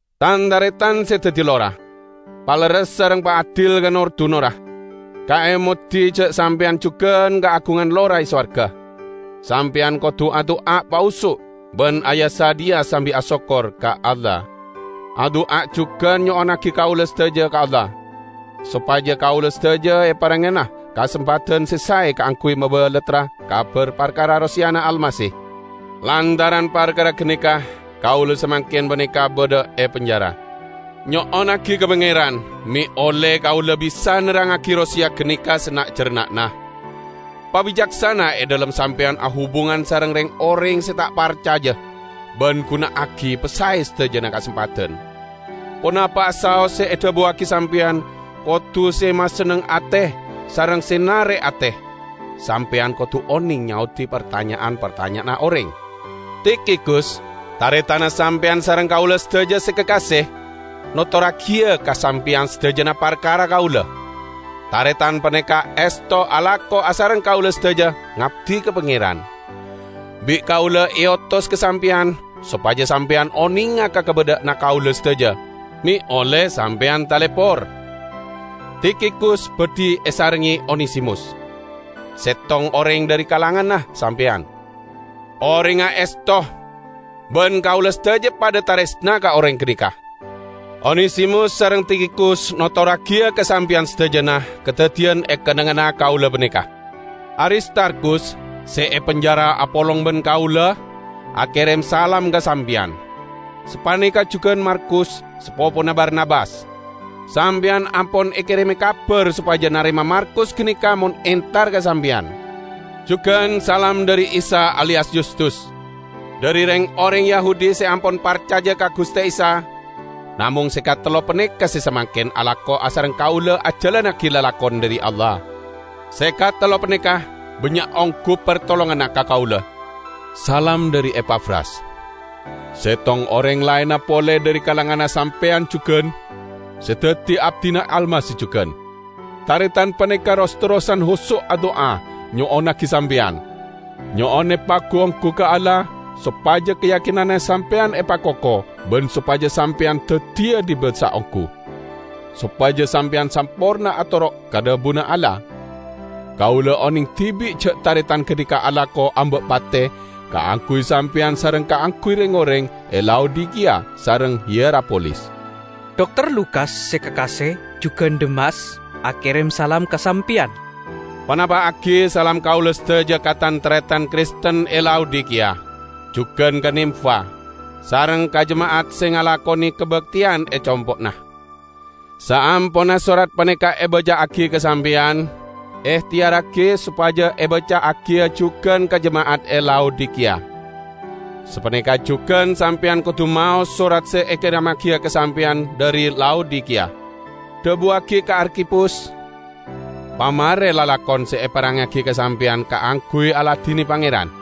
Tan-taretan se daddi lora! Palerres sareng paadil ka nor-dunorra. Kaemodi ja' sampeyan jugan kaagungan lora e sowarga. Sampeyan kodu adu'a pahoso' ban aya-sadhiya sambi asokkor ka Allah. Adu'a jugan nyo'onnagi kaula sadaja ka Allah, sopaja kaula sadaja eparengngana kasempadan se sae kaangguy mabalattra kabar parkara roseyana Almasih. Lantaran parkara ganeka kaula samangken paneka badha e penjara. Nyo'onnagi ka Pangeran me' olle kaula bisa nerrangngagi roseya ganeka sana'-jarna'na. Pabicaksana e dhalem sampeyan ahubungan sareng reng-oreng se ta' parcaja, ban guna'agi pasae sadajana kasempadan. Ponapa'a saos se edhabuwagi sampeyan kodu se masenneng ate sareng se narek ate. Sampeyan kodu oneng nyaodi partanya'an-partanya'anna oreng. Tikhikus, taretanna sampeyan sareng kaula sadaja se kakase, notorragiya ka sampeyan sadajana parkara kaula. Taretan paneka esto alako asareng kaula sadaja ngabdi ka Pangeran. Bi' kaula eotos ka sampeyan sopaja sampeyan onenga ka kabadha'anna kaula sadaja, me' olle sampeyan talepor. Tikhikus badhi esarengnge Onesimus; settong oreng dhari kalanganna sampeyan. Orengnga esto, ban kaula sadaja padha taresna ka oreng ganeka. Onesimus sareng Tikhikus notorragiya ka sampeyan sadajana kadaddiyan e kennengnganna kaula paneka. Aristarkhus, se e penjara apolong ban kaula, akerem salam ka sampeyan. Sapaneka jugan Markus, sapopona Barnabas. (Sampeyan ampon ekereme kabar sopaja narema Markus ganeka mon entar ka sampeyan.) Jugan salam dhari Isa aliyas Yustus. Dhari reng-oreng Yahudi se ampon parcaja ka Guste Isa, namong se katello paneka se samangken alako asareng kaula ajalannagi lalakon dhari Allah. Se katello paneka bannya' onggu partolonganna ka kaula. Salam dhari Epafras. Settong oreng laenna pole dhari kalanganna sampeyan jugan, se daddi abdina Almasih jugan. Taretan paneka ros-terrosan hoso' adu'a nyo'onnagi sampeyan; nyo'on epagu-onggu ka Allah sopaja kayakinanna sampeyan epakoko ban sopaja sampeyan daddiya dibasa onggu, sopaja sampeyan samporna atoro' ka dhabuna Allah. Kaula oneng dibi' ja' taretan ganeka alako amba' pate kaangguy sampeyan sareng kaangguy reng-oreng e Laodikiya sareng Hierapolis. Dokter Lukas se kakase jugan Demas, akerem salam ka sampeyan. Panapa'agi salam kaula sadaja ka tan-taretan Kristen e Laodikiya; jugan ka Nimfa, sareng ka jema'at se ngalakone kabakteyan e compo'na. Saamponna sorat paneka ebaca'agi ka sampeyan, ehteyarragi sopaja ebaca'agiya jugan ka jema'at e Laodikiya. Sapaneka jugan sampeyan kodu maos sorat se ekeremmagiya ka sampeyan dhari Laodikiya. Dhabuwagi ka Arkhipus, "Pamare lalakon se eparengngagi ka sampeyan kaangguy aladine Pangeran."